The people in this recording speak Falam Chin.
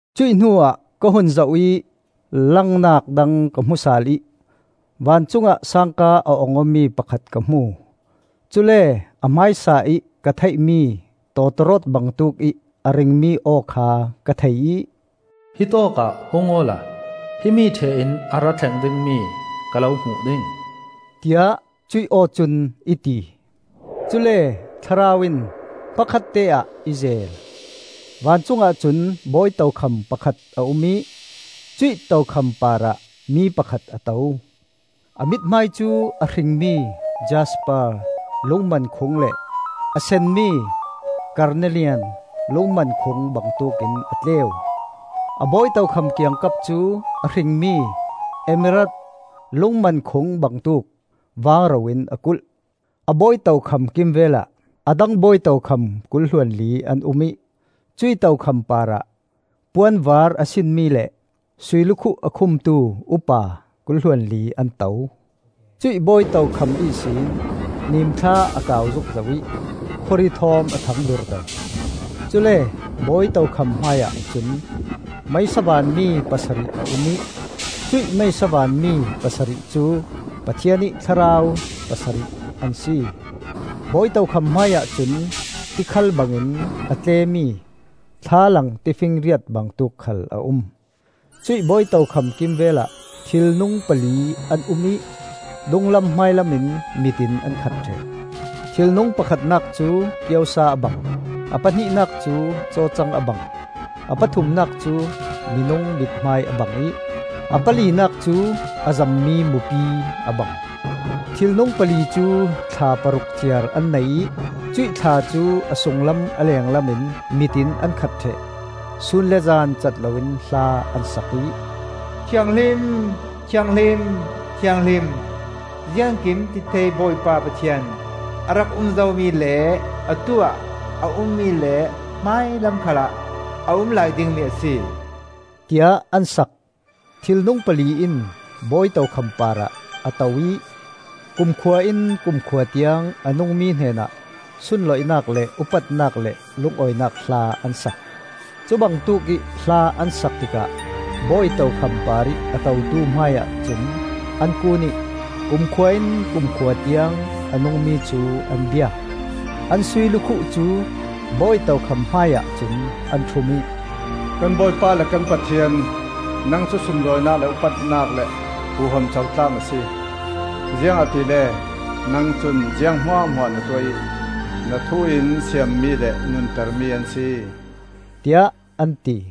Cuih hnuah ka hun zoh ih langnak dang ka hmu sal ih vancungah sangka a ong awmi pakhat ka hmu. Cule a hmaisa-ih ka theihmi tawtawrawt bangtuk ih a ringmi aw kha ka thei ih, “Hi tawkah hung awla himi ṭheh in a ra thleng dingmi ka lo hmuh ding,” tiah cuih aw cun i ti. Cule Thlarau in hmakhatte-ah i zeel. Vancung ahcun bawi tokham pakhat a um ih cuih tokham parah mi pakhat a to. A mithmai cu a hringmi jasper lungmankhung le a senmi karnelian lungmankhung bangtuk in a tleu; a bawi tokham kiangkap cu a hringmi emerald lungmankhung bangtuk vangro in a kulh. A bawi tokham kimvelah a dang bawi tokham kul hluanli an um ih cuih tokham parah puan vaar a sinmi le suilukhuh a khumtu upa kul hluanli an to. Cuih bawi tokham ihsin nimthla a kau zukzo ih khawri thawm a thang durdo. Cule bawi tokham hmaiah cun meisa vanmi pasarih a um ih, cuih meisa vanmi pasarih cu Pathian ih thlarau pasarih an si. Bawi tokham hmaiah cun tikhal bangin a tlemi thlalang tifinriat bangtuk khal a um. Cuih bawi tokham kimvelah thilnung pali an um ih dunglam hmailam in mit in an khat ṭheh. Thilnung pakhatnak cu kiosa a bang; a pahnihnak cu cawcang a bang; a pathumnak cu minung mithmai a bang ih a palinak cu a zammi mupi a bang. Thilnung pali cu thla paruk ciar an nei ih cuih thla cu a sunglam a lenglam in mit in an khat ṭheh. Sun le zan cat loin hla an sak ih, Thianghlim, thianghlim, thianghlim, Ziangkimtithei Bawipa Pathian; A rak um zomi le atu-ah a ummi le hmailam khalah a umlai dingmi a si, tiah an sak. Thilnung pali in bawi tokham parah a to ih kumkhua in kumkhua tiang a nungmi hnenah sunlawinak le upatnak le lungawinak hla an sak. Cubangtuk ih hla an sak tikah bawi tokham parih a totu hmaiah cun an kun ih kumkhua in kumkhua tiang a nungmi cu an biak. An sui lukhuh cu bawi tokham hmaiah cun an ṭhum ih: “Kan Bawipa le kan Pathian, Nang cu sunlawinak le upatnak le huham co tlak na si. Ziangahtile nang cun ziang hmuahhmuah na tuah ih na thu in siam mi le nunter mi an si,” tiah an ti.